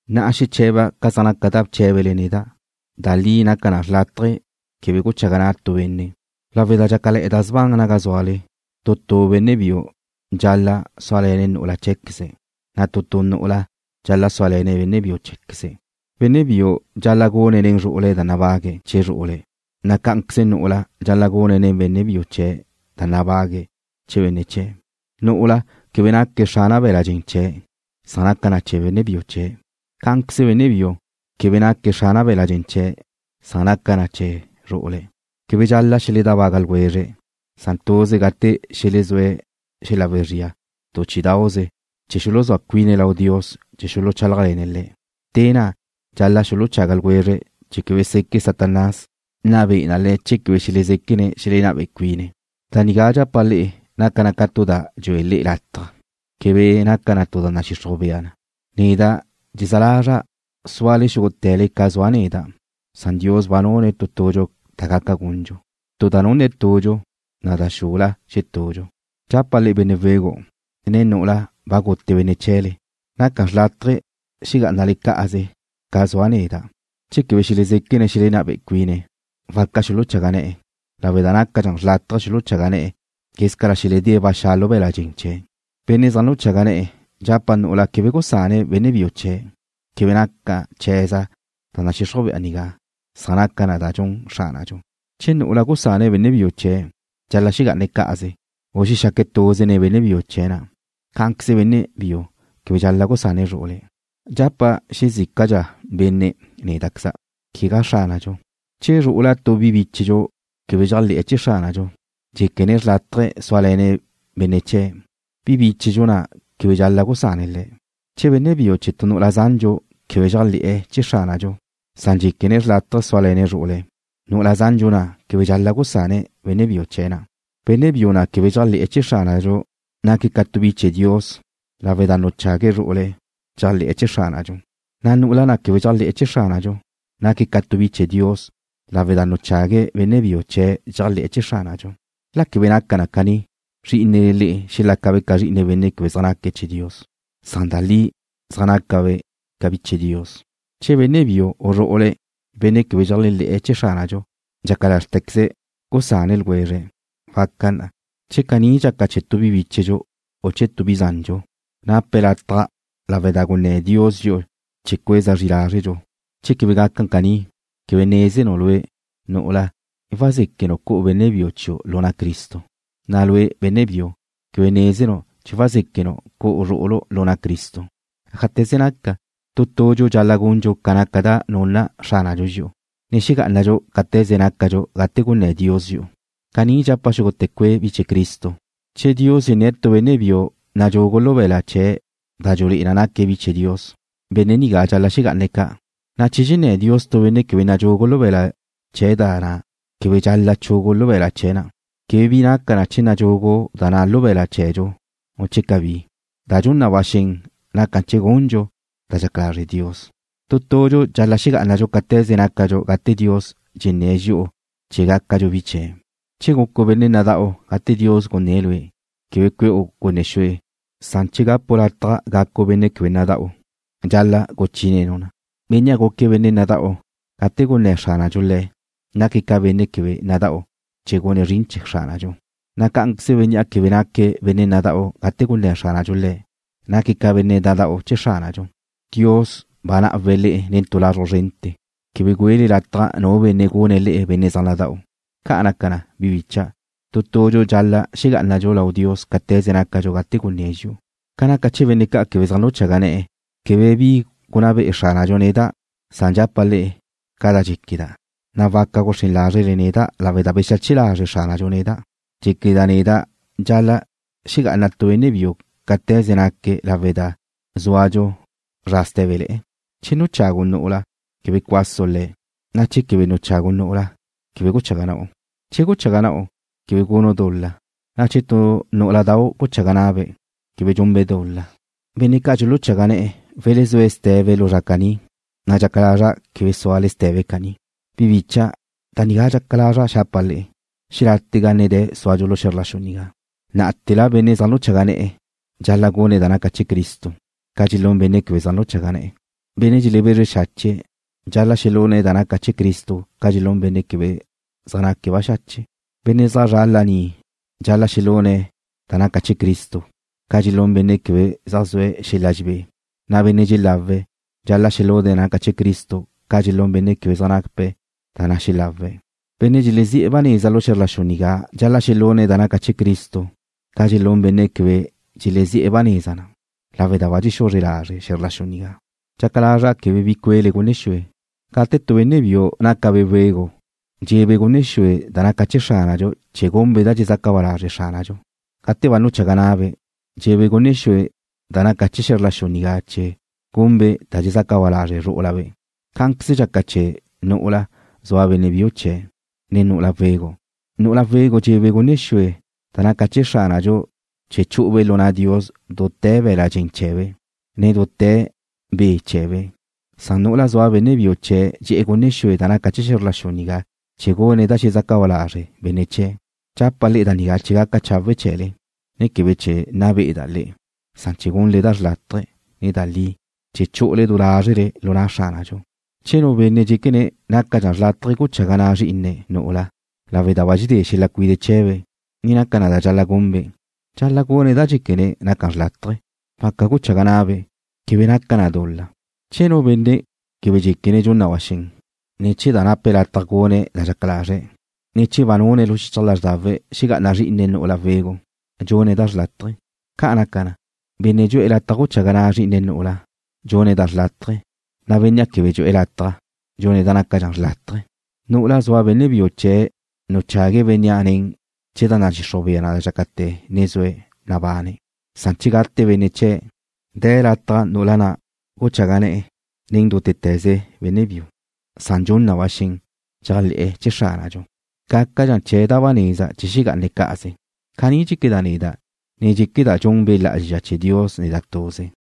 Na'a xeche̱ba' ca zaj naca da bché̱bele neda'. Da li naca xrlátaje quebe guchaga na' tu benne'. Lawe' da dxácale̱'e̱ da sban naga zúale, tu tu benne' biu dxal-la' súale̱ne̱' nu'ula chee̱queze̱', na' tu tu nu'ula dxal-la' súale̱ne̱' benne' biu chee̱queze̱'. Benne' biu dxal-la' gune̱' nen zru'ule̱' da nabague̱' chee̱ zru'ule̱', na' cá'anqueze nu'ula dxal-la' gune̱' nen benne' biu chee̱' da nabague̱' chee̱ benne' chee̱'. Nu'ula na' quebe naque̱' xrana be̱la' dxen chee̱', san naca na chee̱ benne' biu chee̱'. Cá'anqueze benne' biu quebe naque̱' xrana be̱la' dxen chee̱', san naca na chee̱ zru'ule̱'. Quebe dxal-la' xeledábaga ljwezre̱', san tuze gate xelezúe̱' xel-la wezría tu chí'idauze chee̱ xuluzúa cuine̱' lau Dios chee̱ xuluchálajle̱ne̱' Le̱'. Te na' dxal-la' xuluchaga ljwezre̱' chee̱ quebe seque' Satanás nna be'e na le̱' che quebe xelezéquene̱' xelenná be'e cuine̱'. Da nigá dxapa' le'e naca na tu da dxue le'e lataj. Quebe naca na tu da nadxixruj bea na. Neda' dxezá lazra' súale xúgute̱le ca zua' neda', san Dios ba nunne̱' tu tudxu da gaca gundxu. Tu da nunne̱' tudxu, na' da xula xetudxu. Dxapa' benne' wegu', ne nu'ula we̱ze̱be, naca xrlátaje xelexegá'ane̱' cá'aze ca zua' neda'. Che quebe xelezéquene̱' xelenná be'e cuine̱', waca xuluchaga ne̱'e̱, lawe' da nácadxa xrlátaje xuluchaga ne̱'e̱ quézcala xeledée̱' ba xa' lu be̱la' dxen chee̱'. Benne' zaj nuchaga ne̱'e̱ dxapa' nu'ula quebe gusane̱' benne' biu chee̱'. Quebe naca chee̱za' da nadxixruj bea nigá, san naca na da dxun Xránadxu. Che nu nu'ula gusane̱' benne' biu chee̱', dxal-la' xegá'ane̱' cá'aze, u xexaque̱' tuze nen benne' biu chee̱' na'. Cá'anqueze benne' biu quebe dxal-la' gusane̱' zru'ule̱'. Dxapa' xezícadxa benne' néda'queza', quegá Xránadxu, che zru'ula tu bi bíchedxu quebe dxéajle̱'e̱ chee̱ Xránadxu, dxéquene̱' xrlátaje zúale̱ne̱' benne' chee̱', bi bíchedxu na' quebe dxal-la' gusane̱' le̱'. Che benne' biu chee̱ tu nu'ula zandxu quebe dxéajle̱'e̱ chee̱ Xránadxu, san dxéquene̱' xrlátaje zúale̱ne̱' zru'ule̱', nu'ula zandxu na' quebe dxal-la' gusane̱' benne' biu chee̱' na'. Benne' biu na' quebe dxéajle̱'e̱ chee̱ Xránadxu naque̱' ca tu bi chee̱ Dios lawe' da nuchague̱' zru'ule̱' dxéajle̱'e̱ chee̱ Xránadxu, na' nu'ula na' quebe dxéajle̱'e̱ chee̱ Xránadxu naque̱' ca tu bi chee̱ Dios lawe' da nuchague̱' benne' biu chee̱' dxéajle̱'e̱ chee̱ Xránadxu. La quebe naca na caní, zrí'inele le'e xelácabe' ca zri'ine benne' quebe zaj naque̱' chee̱ Dios, san da li zaj nácabe' ca bi chee̱ Dios. Che benne' biu na' u zru'ule̱', benne' quebe dxéajle̱'e̱ chee̱ Xránadxu, dxaca lázrtequeze̱' gusane̱' ljwezre̱', waca na. Che caní dxaca chee̱ tu bi bíchedxu u chee̱ tu bi zandxu, nape̱' lataj lawe' da gunné̱ Dios dxi'u chee̱ cueza zri lázredxu. Che quebe gaca caní, quebe nézenu' lue', nu'ula, che wazéquenu' cu'u benne' biu chiu' lu na' Cristo, na' lue', benne' biu, quebe nézenu' che wazéquenu' cu'u zru'ulu' lu na' Cristo. Ájate̱ze naca, tu tudxu dxal-la' gundxu ca naca da nunna Xránadxu dxi'u, ne xegá'anadxu cáte̱ze nácadxu gate gunné̱ Dios dxi'u. Caní dxapa' xúgute̱ cue' bi chee̱ Cristo. Che Dios dxenné̱' tu benne' biu nadxugu lu be̱la' chee̱' da dxulé'e na naque̱' bi chee̱ Dios, benne' nigá dxal-la' xegá'ane̱' ca', na' che dxenné̱ Dios tu benne' quebe nadxugu lu be̱la' chee̱' da na', quebe dxal-la' chugu lu be̱la' chee̱' da na'. Quebe bi naca che nadxugu da na' lu be̱la' chee̱dxu, u quebe. Da dxun na ba xen naca gundxu da dxaca lazre' Dios. Tu tudxu dxal-la' xegá'anadxu cáte̱ze nácadxu gate Dios dxenné̱' dxi'u chee̱ gácadxu bi chee̱'. Che gucu' benne' nada'u gate Dios gunné̱' lue', quebe cue'u gunne xue, san che gapu' lataj gacu' benne' quebe nada'u, dxal-la' guchínenu' na. Bénnea' guque̱' benne' nada'u gate gunné̱ Xránadxu le̱' naque̱' ca benne' quebe nada'u chee̱ gune̱' zrin chee̱ Xránadxu, na' cá'anqueze bénnea' quebe naque̱' benne' nada'u gate gunné̱ Xránadxu le̱', naque̱' ca benne' nada'u chee̱ Xránadxu. Dios ba ná'awe̱' le'e nen tu lazruj zrente̱. Quebe güele lataj nu benne' gune̱' le'e benne' zaj nada'u. Ca' naca na, bi bicha', tu tudxu dxal-la' xegá'anadxu lau Dios cáte̱ze nácadxu gate gunné̱' dxi'u. Ca naca chee̱ benne' ca' quebe zaj nuchaga ne̱'e̱ quebe bi gunná be'e Xránadxu neda', san dxapa' le'e ca da dxéqueda', na' waca guxrén lázrele neda' lawe' da bexache lazre' Xránadxu neda'. Dxéqueda' neda' dxal-la' xegá'ana tu benne' biu cáte̱ze naque̱' lawe' da zúadxu zra sté̱bele̱'e̱. Che nuchagu' nu'ula quebe cuasu' le̱', na' che quebe nuchagu' nu'ula, quebe guchaga na'u. Che guchaga na'u, quebe gunu' dul-la, na' che tu nú'uladau' guchaga na'abe', quebe gunbe' dul-la. Benne' ca' dxuluchaga ne̱'e̱ welezúe̱' ste̱be lu zra caní, na' dxaca lazra' quebe súale ste̱be caní. Bi bícha'dau', da nigá dxaca lazra' xapa' le'e. Xelátega ne de̱ súadxu lu xe̱zr la xu nigá. Ná'ate̱la benne' zaj nuchaga ne̱'e̱ dxal-la' gune̱' da naca chee̱ Cristo ca dxelún benne' quebe zaj nuchaga ne̱'e̱. Benne' dxelebezre xache̱' dxal-la' xelune̱' da naca chee̱ Cristo ca dxelún benne' quebe zaj naque̱' baxache'. Benne' zaj zra' laní dxal-la' xelune̱' da naca chee̱ Cristo ca dxelún benne' quebe zaj zue̱' xel-la dxebé, na' benne' dxelá'awe̱' dxal-la' xelune̱' da naca chee̱ Cristo ca dxelún benne' quebe zaj nape̱' da na' dxelá'awe̱'. Benne' dxelezi'e̱ ba neza lu xe̱zr la xu nigá dxal-la' xelune̱' da naca chee̱ Cristo ca dxelún benne' quebe dxelezi'e̱ ba neza na, lawe' da ba dxexuzre lazre' xe̱zr la xu nigá. Dxaca lazra' quebe bi cue'le gunne xue. Gate tu benne' biu nácabe' wegu' dxe'ebe' gunne xue da naca chee̱ Xránadxu chee̱ gunbe' da dxezaca ba lazre' Xránadxu. Gate ba nuchaga ne̱'e̱, dxe'e̱ gunne xue da naca chee̱ xe̱zr la xu nigá chee̱ gune̱' da dxezaca ba lazre' zru'ule̱'. Cá'anqueze dxaca chee̱ nu'ula zua benne' biu chee̱', ne nu'ula wegu'. Nu'ula wegu' dxe'ebe' gunne xue da naca chee̱ Xránadxu chee̱ chu'ube' lu na' Dios dute̱ be̱la' dxen chee̱be', ne dute̱ be' chee̱be', san nu'ula zua benne' biu chee̱' dxe'e̱ gunne xue da naca chee̱ xe̱zr la xu nigá chee̱ gune̱' da xezaca ba lazre' benne' chee̱'. Dxapa' le'e da nigá chee̱ gaca chawe' chee̱le, ne quebe chee̱ nna be'eda' le'e, san chee̱ gunle da xrlátaje, ne da li, chee̱ chu'ule du lázrele lu na' Xránadxu. Che nu benne' dxéquene̱' nácadxa xrlátaje guchaga na' zrí'ine̱' nu'ula lawe' da ba dxedé xel-la cuide' chee̱be', ne naca da dxal-la' gunbe', dxal-la' gune̱' da dxéquene̱' naca xrlátaje. Waca guchaga na'abe'. Quebe naca na dul-la. Che nu benne' quebe dxéquene̱' dxun na ba xen, ne che nape̱' lataj gune̱' da dxaca lazre̱', ne che ba nune̱' lu xichaj lázrdawe̱' xegá'ana zrí'ine̱' nu'ula wegu', dxune̱' da xrlátaje. Ca' naca na, benne' dxu'e̱ lataj guchaga na'abe' zrí'ine̱' nu'ula, dxune̱' da xrlátaje, na' bénnea' quebe dxu'e̱ lataj dxune̱' da nácadxa xrlátaje. Nu'ula zua benne' biu chee̱' nuchague̱' bénnea' ne̱ chee̱ da nadxixruj bea na dxácate̱ ne zue̱' nabane̱', san che gate benne' chee̱', de̱ lataj nu'ula na' guchaga ne̱'e̱ nen nútete̱ze benne' biu, san dxun na ba xen dxéajle̱'e̱ chee̱ Xránadxu. Gácadxa chee̱' da ba neza che xegá'ane̱' cá'aze. Caní dxéqueda' neda', ne dxéqueda' dxun Be' Lá'azxa chee̱ Dios neda' tuze.